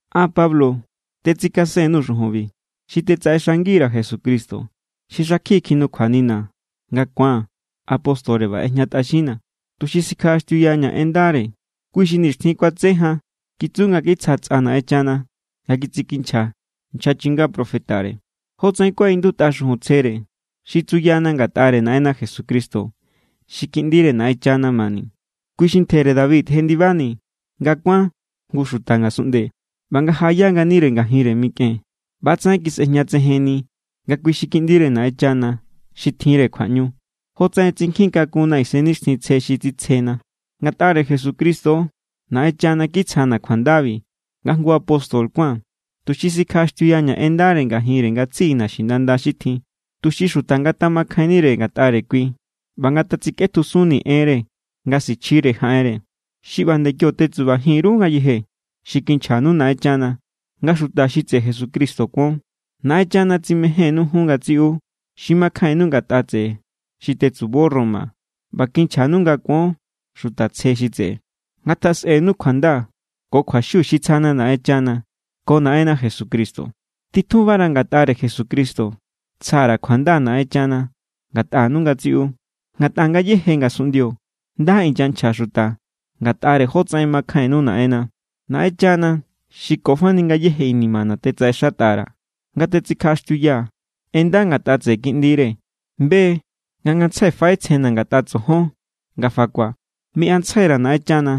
An, Pablo, tetsikasen_nuu̱ xujunbi, xi tetsaꞌexangi_ra̱ Jesucristo xi xakjiꞌi kjinukjuanina̱ nga ku̱aa̱n apóstore ꞌba ꞌejñatꞌaxinna̱, tuxi sikjaꞌaxtiuyaña̱ en ndare. Kui xi nixtjin kuatse jan kitsu nga kitsja tsꞌa Naꞌenchana nga kitsikinchja nchja chinga profetare, jotsaꞌen kuaꞌindutꞌa xujun tsjere, xi tsuyana ngatꞌare Naꞌenna Jesucristo xi Kiꞌndire Naꞌenchana mani. Kui xi ntjere David jendibani nga kuán jngu xuta ngasunꞌnde. ꞌBa nga jaꞌaya nganire ngajinre mikꞌen ꞌba=tsaꞌen kisꞌejñatsejenni nga kui xi Kiꞌndire Naꞌenchana xi tjinre kjuaꞌñu, jotsaꞌen tsinkjin kakunna Isennixtjintsje xi tsitsjena. Ngatꞌare Jesucristo= Naꞌenchana kitsjana̱ kjuandabi nga jngu apóstol kuáa̱n. Tuxi sikjaꞌaxtiuyaña̱ en ndare ngajinre ngatsiꞌi naxinanda xi tjin, tuxi xuta ngatjamakjainnire ngatꞌare kui ꞌba ngatatsikꞌetjusunni enre nga sichjire jaꞌenre. Xi ꞌba nde kio tetsubajin_ru ngayeje xi kinchjanu Naꞌenchana nga xuta xi tseꞌe Jesucristo kuon. Naꞌenchana tsimejénnu jun ngatsiꞌu xi makjainnu ngatꞌa tseꞌe xi tetsubo Roma ꞌba kinchjanu nga kuon xuta tsje xi tseꞌe. Ngatjasꞌenu kjuanda ko kjuaxiu xi tsjana Naꞌenchana ko Naꞌenna Jesucristo. Titjunfara̱, ngatꞌare Jesucristo tsja_ra̱ kjuanda Naꞌenchana ngatꞌanu ngatsiꞌu, ngatꞌa ngayéje ngasunꞌndio nda inyanchja xuta ngatꞌare jotsaꞌen makjainnu Naꞌenna. Naꞌenchana xi ko fani ngayéje inimana̱ tetsaꞌexatꞌa_ra̱ nga tetsikjaꞌaxtiuyaa̱ en nda ngatꞌa tseꞌe Kiꞌndire be= nga ngantsjai faꞌetsjena̱ ngatꞌa tsojon nga fakua̱. Miꞌantsjai_ra̱ Naꞌenchana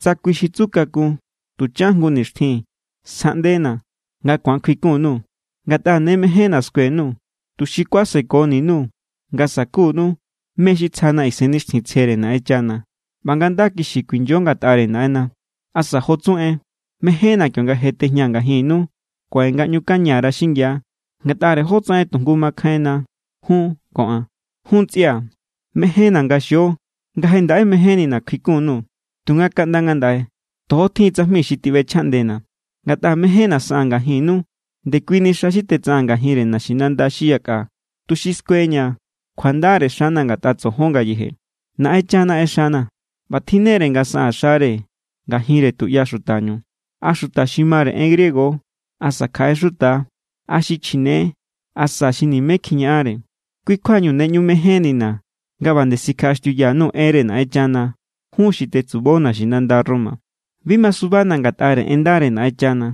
tsa kui xi tsu kakun tuchan jngu nixtjin sjaꞌndena̱, nga ku̱an kjuikun_nuu̱. Ngatꞌa ne mejénna̱ skue_nuu̱, tuxi kuasekoni_nuu̱ nga sa̱kunu mé= xi tsjana Isennixtjintsjere Naꞌenchana, ꞌba nga nda kixi kuinyo ngatꞌare Naꞌenna. Asa jo tsu en, mejénna̱ kionga je tejñaa̱ ngajinnu kuaꞌe ngaꞌñukaña_ra xingia ngatꞌare jotsaꞌen tujngu makjainna jun ko an. Jun ntsꞌia̱, mejénna̱ nga xio nga je ndaꞌe mejénnina̱ kjuikun_nuu̱, tunga kaꞌnda ngandaꞌe tojo tjin tsajmi xi tiꞌbechjaꞌndena̱. Ngatꞌa mejénna̱ saꞌaa̱n ngajinnu ndekuini xa xi tetsaꞌaa̱n ngajinre naxinanda xi yakꞌa tuxi skueña̱ kjuandare xana̱ ngatꞌa tsojon ngayeje. Naꞌenchana ꞌexana̱ ꞌba tjinnere nga saꞌaa̱n xare ngajinre tuꞌya xutañu, a xuta xi mare en griego= asa kjaꞌe xuta=, a xi chjine= asa xi nimé kjiñaꞌanre. Kui= kjuañu ne ꞌñu mejénnina̱ nga ꞌba nde sikjaꞌaxtiuya_nuu̱ enre Naꞌenchana jun xi tetsubo naxinanda Roma. Bi masubana̱ ngatꞌare en ndare Naꞌenchana,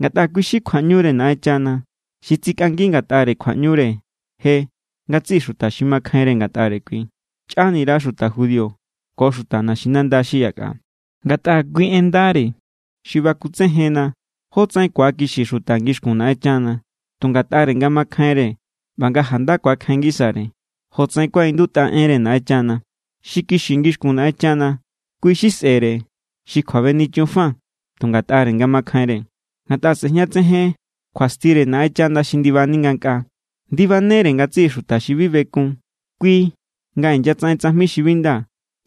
ngatꞌa kui= xi kjuaꞌñure Naꞌenchana xi tsikꞌangi ngatꞌare kjuaꞌñure je ngatsiꞌi xuta xi makjainre ngatꞌare kui, chꞌanira xuta judío ko xuta naxinanda xi yakꞌa. Ngatꞌare kui en ndare xi bakutsejenna jótsaꞌen ku̱akixi xuta ngixkun Naꞌenchana, tu ngatꞌare nga makjainre ꞌba nga janda ku̱akjain ngisare, jotsaꞌen kuaꞌindutꞌa enre Naꞌenchana: “Xi kixi ngixkun Naꞌenchana, kui xi sꞌere xi kjuabenichun fa tu ngatꞌare nga makjainre.” Ngatꞌa sꞌejñatsejen kjuastire Naꞌenchana xi ndibani ngankꞌaa. Ndibanere ngatsiꞌi xuta xi bi bekun kui nga inyatsaꞌen tsajmi xi bi nda,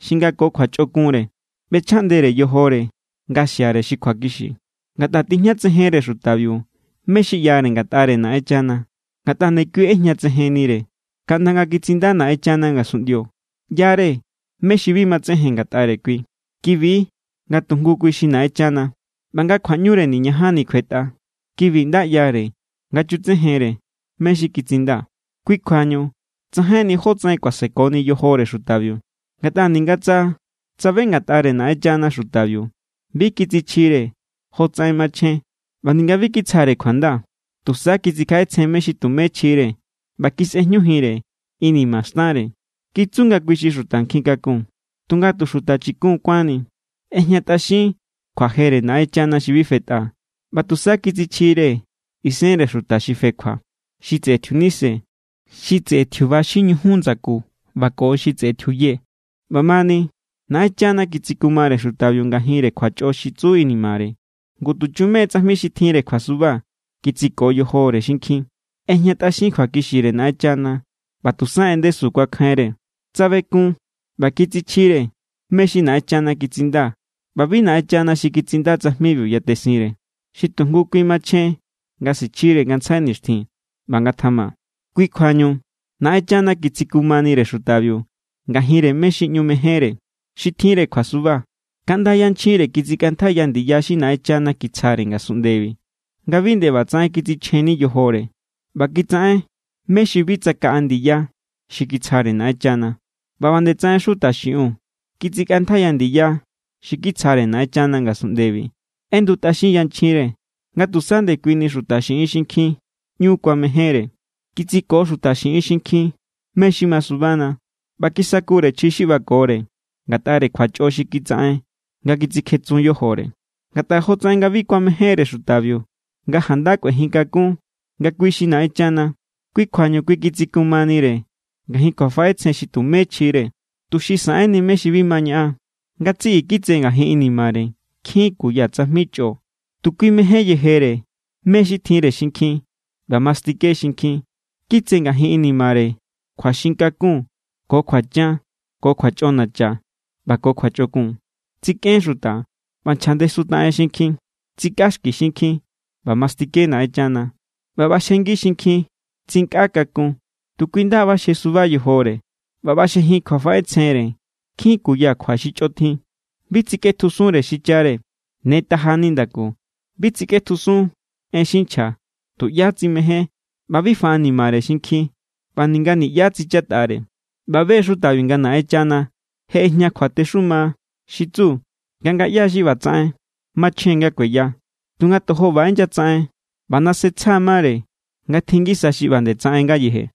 xi nga ko kjuachꞌokunre ꞌbechjaꞌndere yojore nga xiare xi kjuakixi. Ngatꞌa tijñatsejenre xutabiu mé= xi ꞌyare ngatꞌare Naꞌenchana, ngatꞌa ndekui ꞌejñatsejennire. Kaꞌnda nga kitsinda Naꞌenchana ngasunꞌndio, ꞌya=re mé= xi bi matsejen ngatꞌare kui. Kibi= nga tujngu kui xi Naꞌenchana ꞌba nga kjuaꞌñure niñajanni kjuetꞌa. Kibi nda ꞌyare nga chutsejenre mé= xi kitsinda. Kui= kjuañu tsajainni jótsaꞌen kuasekoni yojore xutabiu. Ngatꞌa ninga tsa tsabe ngatꞌare Naꞌenchana xutabiu, bi kitsichjire jotsaꞌen machjen ꞌba ninga bi kitsjare kjuanda. Tusa kitsikjaꞌetsjen mé= xi tumé chjire ꞌba kisꞌejñujinre inima xtanre. Kitsu nga kui= xi xuta nkjin kakun, tunga tu xuta chikun kuánni. ꞌEjñatꞌaxin kjuajere Naꞌenchana xi bi fetꞌa, ꞌba tusa kitsichjire isenre xuta xi fekjua, xi tseꞌe tjiunise, xi tseꞌe tjiuba xi ñujun ndsaku ꞌba ko xi tseꞌe tjiuye. ꞌBamani Naꞌenchana kitsikumare xutabiu ngajinre kjuachꞌo xi tsu inimare. Ngu tuchume= tsajmi xi tjinre kjuasuba kitsiko yojore xinkjin. ꞌEjñatꞌaxin kjuakixire Naꞌenchana ꞌba tusa en ndesu kuakjainre. Tsabekun ꞌba kitsichjire mé= xi Naꞌenchana kitsinda ꞌba bi Naꞌenchana xi kitsinda tsajmibiu yatesinre. Xi tujngu kui machjen nga sichjire ngantsjai nixtjin. ꞌBa ngatjama. Kui= kjuañu Naꞌenchana kitsikumanire xutabiu ngajinre mé= xi ꞌñu mejénre, xi tjinre kjuasuba. Kaꞌnda yanchjinre kitsikꞌantjaiya ndiya xi Naꞌenchana kitsjare ngasunꞌndebi nga bi nde ꞌbatsaꞌen kitsichjenni yojore. ꞌBa kitsaꞌen mé= xi bi tsakaꞌa ndiya xi kitsjare Naꞌenchana. ꞌBa ꞌba nde tsaꞌen xuta xiꞌiun kitsikꞌantjaiya ndiya xi kitsjare Naꞌenchana ngasunꞌndebi. ꞌEndutꞌaxin yanchjinre nga tusa ndekuini xuta xiꞌin xinkjin ꞌñu kuamejénre. Kitsiko xuta xiꞌin xinkjin mé= xi masubana. ꞌBa kisakure chji xi ꞌbakore ngatꞌare kjuachꞌo xi kitsaꞌen nga kitsikjetsun yojore. Ngatꞌa jotsaꞌen nga bi kuamejénre xutabiu nga janda kꞌuejin kakun nga kui= xi Naꞌenchana, kui= kjuañu kui kitsikumanire ngajin kjuafaꞌetsjenre xi tumé chjire, tuxi saꞌenni mé= xi bi ma ñaꞌan. Ngatsiꞌi kitse ngajin inimare nkjin kuya tsajmi chꞌo. Tu kui mején yejere mé= xi tjinre xinkjin ꞌba mastike xinkjin. Kitse ngajin inimare kjuaxin kakun ko kjuachan ko kjuachꞌonacha ꞌba ko kjuachꞌokun. Tsikꞌen xuta ꞌba nchjandesutaꞌen xinkjin. Tsikꞌaxki xinkjin, ꞌba mastike Naꞌenchana, ꞌba ꞌbaxjengi xinkjin. Tsinkꞌa kakun, tu kui nda ꞌbaxje suba yojore, ꞌba ꞌbaxjejin kjuafaꞌetsjenre nkjin kuya kjua xi chꞌotjin. Bi tsikꞌetjusunre xichare, ne taja= nindaku, bi tsikꞌetjusun en xi nchja, tuꞌyá tsimején, ꞌba bi faꞌanimare xinkjin ꞌba ninga niꞌyá tsichatꞌare. ꞌBa be= xutabiu nga Naꞌenchana je ꞌejña kjuatexuma xi tsu nga ngaꞌya= xi ꞌbatsaꞌen machjen nga kueya. Tunga tojo ꞌba inyatsaꞌen ꞌba nase tsja= mare nga tjin ngisa xi ꞌba nde tsaꞌen ngayeje.